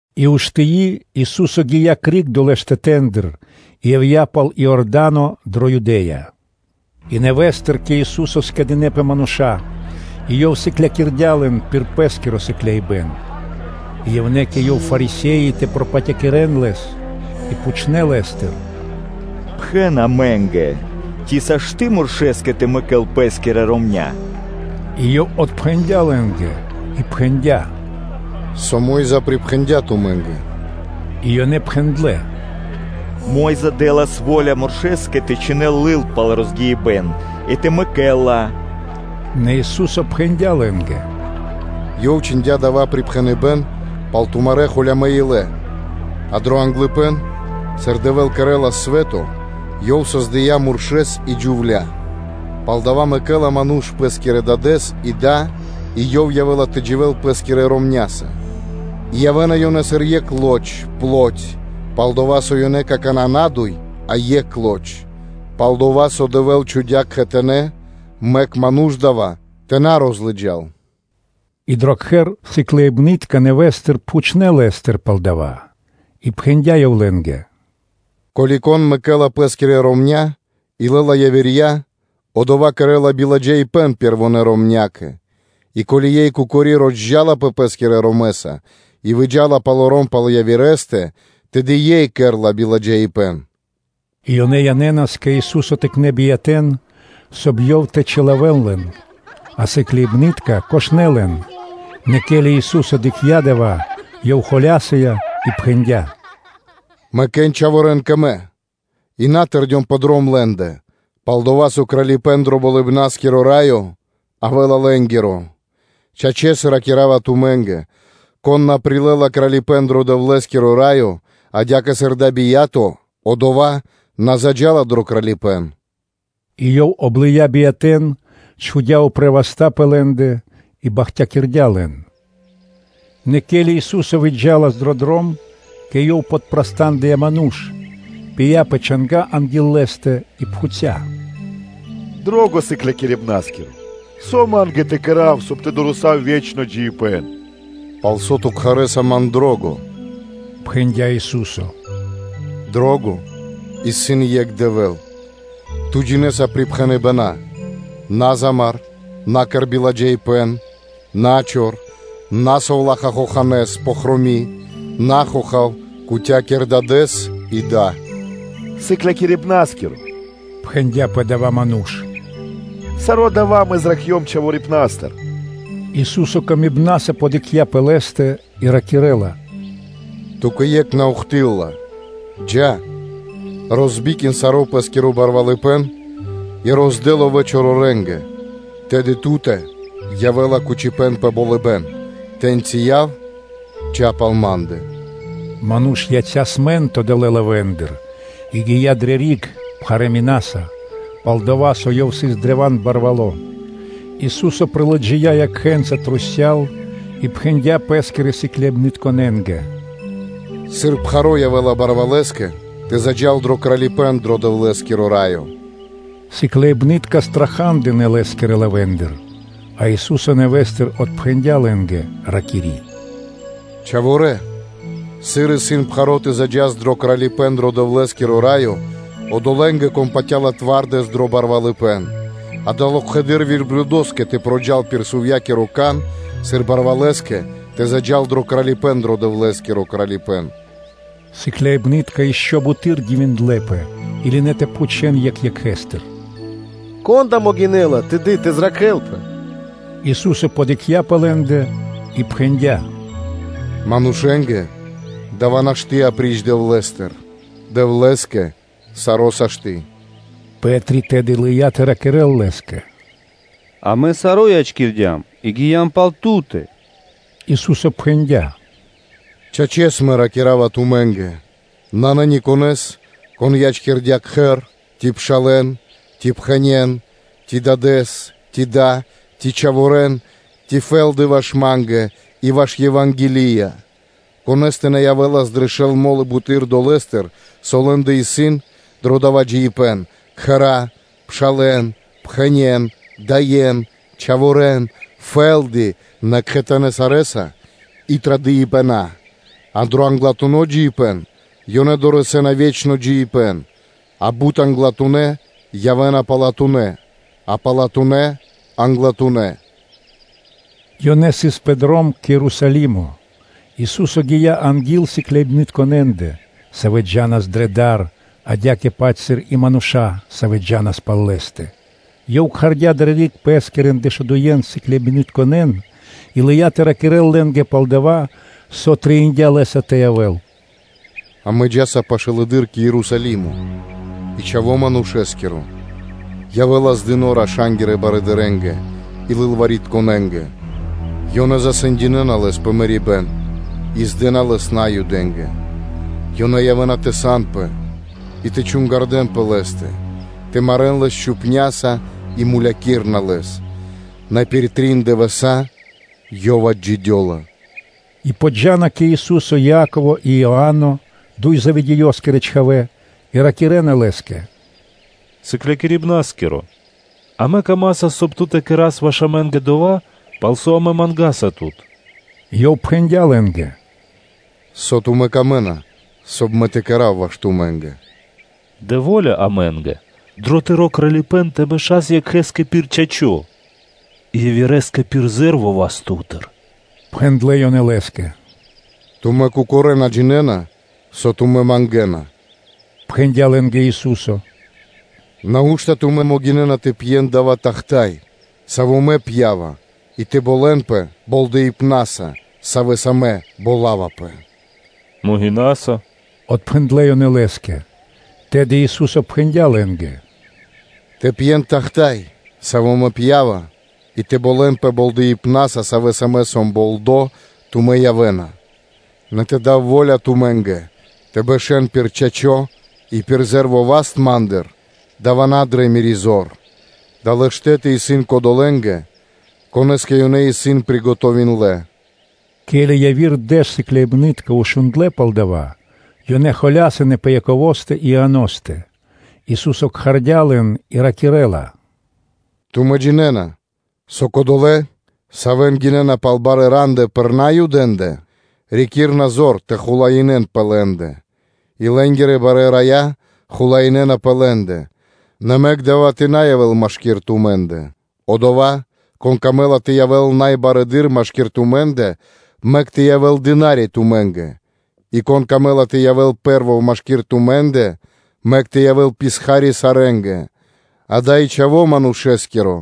И уштыи, Ису́со гия́ криг долэ́ штэтэ́ндыр, и явдя́ пал Иорда́но дрэ Юдэ́я; и нэвэ́стыр кэ Ису́со скэдынэ́пэ мануша́, и Ёв сыклякирдя́ лэн пир Пэ́скиро сыкляибэн. И явнэ́ кэ Ёв Фарисе́и тэ пропатякирэн Лэс, и пхучнэ́ Лэ́стыр: “Пхэн амэ́нгэ, ци сашты́ (можна) муршэскэ тэ мэкэл пэ́скирэ ромня́?” И Ёв отпхэндя́ лэ́нгэ и пхэндя́: “Со Мо́йза (Моисеё) припхэндя́ тумэ́нгэ?” И ёнэ пхэндлэ́: “Мо́йза дэ́лас во́ля муршэскэ тэ чхинэл лыл пал розгиибэн и тэ мэкэл ла.” Нэ Ису́со пхэндя́ лэ́нгэ: “Ёв чхиндя́ дава́ припхэныбэ́н пал тумарэ́ холямэ́ илэ. А дро англыпэ́н (начало), сыр Дэвэ́л создэлас свэ́то, Ёв создыя́ муршэ́с и джувля́. Палдава́ мэкэ́ла ману́ш пэ́скирэ дадэ́с и да, и ёв явэ́ла тэ дживэ́л пэ́скирэ ромня́са; и явэ́на ёнэ сыр екх лоч (плоть); пал-дова́ со ёнэ исын какана́ на дуй, а екх лоч. Пал-дова́ со Дэвэ́л чхудя́ кхэтанэ́, мэк адава́ ману́ш тэ на розмарэл.” И дро кхэр сыкляибны́тка нэвэ́стыр пхучнэ́ Лэ́стыр пал дава́. И пхэндя́ Ёв лэ́нгэ: “Ко́ли кон мэкэ́ла пэ́скирэ ромня́ и лэ́ла явирья, одова́ кэрэ́ла биладжаипэ́н пэрвонэ́ ромнякэ; и ко́ли ёй кокори розджалапэ пэ́скирэ ромэса и выджа́ла палоро́м пал явирэ́стэ, тэды ёй кэрэ́ла биладжаипэ́н.” И ёнэ янэ́нас кэ Ису́со тыкнэ́ биятэ́н, соб (кай) Ёв тэ чилавэл лэн; а сыкляибны́тка кошлэ лэн [на домэкэнас-р.с.] Нэ ке́ли Ису́со дыкхця́ дава́, Ёв холя́сыя и пхэндя́: “Мэкэ́н чхаворэ́н кэ Мэ; и на тэрдён пэ дром лэ́ндэ, пал-дова́ со Кралипэ́н дро Болыбна́скиро Раё явэ́ла лэ́нгиро. Чачэс, ракира́ва тумэ́нгэ: кон на прилэ́ла Кралипэ́н дро Дэвлэ́скиро Раё, адя́кэ сыр дава́ бия́то, одова́ на заджа́ла дро Кралипэ́н.’” И Ёв облыя биятэ́н, чхудя́ упрэ́ васта́ пэ лэ́ндэ, и бахтякирдя́ лэн. Нэ ке́ли Ису́со выджа́лас дро дром, кэ Ёв подпрастандыя ману́ш, пыя́ пэ чанга́ анги́л Лэ́стэ и пхуця́: “Дро́го Сыклякирибна́скиро! Со ма́нгэ тэ кэра́в, соб (кай) тэ дорэсав паш дро ве́чно джиибэ́н?” “Палсо́ ту кхарэса ман ‘Дро́го?’” – пхэндя́ Ису́со. ‘Дро́го исын екх Дэвэ́л. Ту джинэ́са припхэныбэна́: ‘На замар, на кэр биладжаипэ́н, на чор, на совлаха́ хоханэ́с (пэфроми), на хохав, кутякир дадэ́с и да.’” “Сыклякирибна́скиро, – отпхэндя́ и пхэндя́ пэ дава́ ману́ш, – саро́ дава́ мэ зракхцём чхаворипнастыр.” Ису́со ласкаса подыкхця́ пэ лэ́стэ и ракирэ́ла: “Ту́кэ екх на ухты́лла (на́доси): джа́, розбикин саро́ пэ́скиро барвалыпэ́н, и роздэ ловэ́ чорорэнгэ, тэды ту́тэ явэ́ла кучипэ́н пэ болыбэ́н; тэ́ньчи яв, джа́ пал Ма́ндэ.” Ману́ш яця́ смэнтно (скучно) далэ́ лавэ́ндыр, и гия́ дрэ риг пхарэ́ минаса: пал-дова́, со Ёв сыс древа́н барвало́. Ису́со лыджия́ трусця́л и пхэндя́ Пэ́скирэ сыкляибнытконэ́нгэ: “Сыр пхаро́ явэ́ла барвалэскэ тэ заджа́л дро Кралипэ́н дро Дэвлэ́скиро Раё.” Сыкляибны́тка страха́дынэ Лэ́скирэ лавэ́ндыр, а Ису́со нэвэ́стыр отпхэндя́ лэ́нгэ, ракири́: “Чхаворалэ! Сыр исын пхаро́ тэ заджа́н дро Кралипэ́н дро Дэвлэ́скиро Раё одолэ́нгэ, кон патя́ла зоралэ́с дро барвалыпэ́н. Дава́ локхэды́р верблюдоскэ тэ проджал пир сувьякиро кан, сыр барвалэскэ тэ заджа́л дро Кралипэ́н дро Дэвлэ́скиро Кралипэ́н.” Сыкляибны́тка ишчо (инкэ́) буты́р дивиндлэ́пэ и лынэ́ тэ пхучэ́н екх екхэстыр: “Кон да могинэ́ла тэды тэ зракхэлпэ?” Ису́со подыкхця́ пэ лэ́ндэ и пхэндя́: “Манушэ́нгэ дава́ нашты́ апри́ч Дэвлэ́стэ. Дэвлэ́скэ саро́ сашты́.” Пэ́три тэды лыя́ тэ ракирэ́л Лэ́скэ: “Амэ саро́ ячкирдям и гиям пал Ту́тэ.” Ису́со пхэндя́: “Чачэс, Мэ ракира́ва тумэ́нгэ: Нанэ никонэ́с, кон ячкирдя́ кхэр, ци пшалэ́н, ци пхэнен, ци дадэ́с, ци да, ци чхаворэ́н, ци фэ́лды ваш Ма́нгэ и ваш Ева́нгелия, конэ́стэ на явэ́лас дрэ шэл мо́лы буты́р долэ́стыр, со лэ́ндэ исын дро дава́ джиибэ́н: кхэра́, пшалэ́н, пхэнен, даен, чхаворэ́н, фэ́лды, нэ кхэтанэ́ сарэ́са и традыпэна, а дро англатуно́ джиибэ́н ёнэ дорэсэ́на (долэна) ве́чно джиибэ́н. А бут англатунэ́, явэ́на палатунэ́, а палатунэ́ – англатунэ́.’” Ёнэ сыс дро дром кэ Ерусалимо; Ису́со гия́ анги́л сыкляибнытконэндэ, савэ́ джа́нас дрэ дар, адя́кэ-паць сыр и мануша́, савэ́ джа́нас пал Лэ́стэ. Ёв кхардя́ дрэ риг Пэскирэн дэшудуен сыкляибнытконэ́н и лыя́ тэ ракирэ́л лэ́нгэ пал дова́, со трэиндя́ Лэ́са тэ явэ́л: “Амэ джа́са пашылэды́р кэ Ерусалимо, и Чхаво́ Манушэ́скиро явэ́ла здыно раша́нгирэ барыдырэ́нгэ и лылваритконэнгэ: ёнэ засэндинэна Лэс пэ марибэ́н и здэна Лэс Наюдэ́нгэ; ёнэ явэ́на тэ санпэ холямэс, и тэ чунгардэн пэ Лэ́стэ, тэ марэ́н Лэс чупняса и мулякирэна Лэс, нэ пир трин дывэса́ Ёв отджидёла.” Яково́скиро и Иано́скиро Мангипэ́н (Па́тери) И джа́на пашылэды́р кэ Ису́со Яково и Иа́но, дуй Заведеёскирэ чхавэ́, и ракирэ́на Лэ́скэ: “Сыклякирибна́скиро, амэ мыслинаса дро ило́, соб (кай) Ту тэ кэрэ́с ваш амэ́нгэ дова́, пал со амэ мангаса Тут.” Ёв пхэндя́ лэ́нгэ: “Со исын тумэ́нгэ пир ило́, соб (кай) Мэ тэ кэра́в ваш тумэ́нгэ?” “Дэ во́ля амэ́нгэ дро Тыро́ Кралипэ́н тэ бэшас екхэ́скэ пир чачо́ и явирэскэ пир зэ́рво (ле́во) васт Ту́тыр”, – пхэндлэ́ ёнэ Лэ́скэ. “Тумэ́ кокорэ́ на джинэ́на, со тумэ́ мангэна”, – пхэндя́ лэ́нгэ Ису́со. “Нау́што тумэ́ могинэ́на тэ пьен дава́ тахта́й, саво́ Мэ пьява, и тэ болэнпэ болдэипнаса, савэ́са Мэ болавапэ?” “Могинаса”, – отпхэндлэ́ ёнэ Лэ́скэ. Тэды Ису́со пхэндя́ лэ́нгэ: “Тэ пьен тахта́й (чаша), саво́ Мэ пьява, и тэ болэнпэ болдэипнаса, савэ́са Мэ сом болдо, тумэ́ явэ́на; нэ тэ дав во́ля тумэ́нгэ тэ бэшэ́н пир чачо́ и пир зэ́рво васт Ма́ндыр, – дава́ исын на дрэ Мири́ зор; далэ́ штэ́ты исын кодолэ́нгэ, конэ́скэ ёнэ исын приготовиндлэ.” Ке́ли яви́р дэш сыкляибны́тка шундлэ́ пал дава́, ёнэ холясынэ пэ Яковостэ и Ианостэ. Ису́со кхардя́ лэн и ракирэ́ла: “Тумэ́ джинэ́на, со кодолэ́, савэ́н гинэ́на пал барэ́ рандэ пэ Наюдэ́ндэ, рикирна зор тэ хулаинэн пэ лэ́ндэ, и лэ́нгирэ барэ́ рая хулаинэна пэ лэ́ндэ: нэ мэк дава́ тэ на явэ́л машки́р тумэ́ндэ. Одова́, кон камэ́ла тэ явэ́л най барэды́р машки́р тумэ́ндэ, мэк тэ явэ́л дына́ри тумэ́нгэ, и кон камэ́ла тэ явэ́л пэ́рво машки́р тумэ́ндэ, мэк тэ явэ́л писха́ри сарэ́нгэ. Адя́кэ и Чхаво́ Манушэ́скиро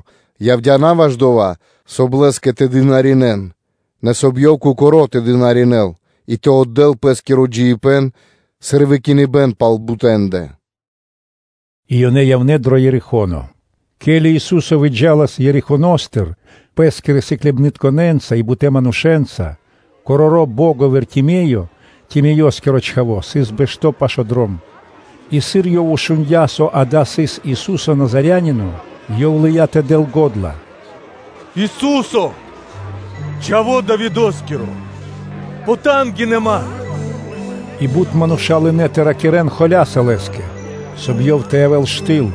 явдя́ на ваш дова́, соб (кай) Лэ́скэ тэ дынаринэ́н (тэ служынэн), нэ соб (кай) Ёв кокоро́ тэ дынаринэ́л и тэ отдэ́л Пэ́скиро джиибэ́н, сыр выкиныбэ́н пал бутэндэ.” И ёнэ явнэ́ дро Ерихо́но. Ке́ли Ису́со выджа́лас Ерихоностыр Пэ́скирэ сыкляибнытконэ́нца и бутэ́ манушэ́нца, короро́ бо́го Вартимеё, Тимеёскиро чхаво́, сыс бэшто́ пашы́л дром. И, сыр Ёв шундя́, со дава́ сыс Ису́со Назарянино, ёв лыя́ тэ дэл го́дла: “Ису́се, Чхаво́ Давидо́скиро! Потангинэ (пожалин) ман!” И бут мануша́ лынэ́ тэ ракирэ́н холя́са Лэ́скэ, соб (кай) ёв тэ явэ́л штыл,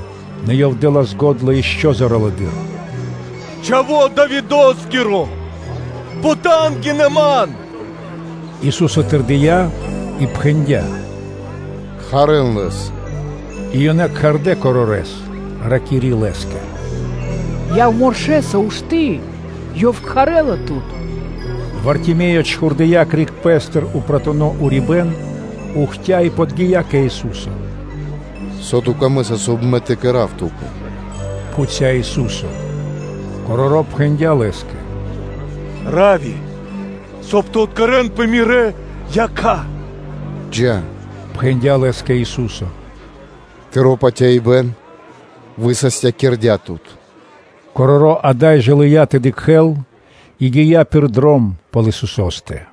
нэ ёв дэ́лас го́дла ишчо (инкэ́) зоралэды́р: “Чхаво́ Давидо́скиро! Потангинэ ман!” Ису́со тэрдия́ и пхэндя́: “Кхарэ́н лэс.” И ёнэ кхардэ́ корорэс, ракири́ Лэ́скэ: “Яв муршэса, ушты́, Ёв кхарэ́ла тут.” Вартимеё чхурдыя́ криг пэ́стыр упратуно урибэ́н, ухтя и подги́я кэ Ису́со. “Со тўкэ трэй, соб (кай) Мэ тэ кэра́в ту́кэ?” – пхуця́ Ису́со. Короро́ пхэндя́ Лэ́скэ: “Раввуни, соб (кай) тэ откэрэнпэ Мирэ́ якха́.” “Джа́, – пхэндя́ Лэ́скэ Ису́со, – тыро́ патяибэ́н высастякирдя́ тут.” Короро́ ада́й жа лыя́ тэ дыкхэ́л и гия́ пир дром пал Исусо́стэ.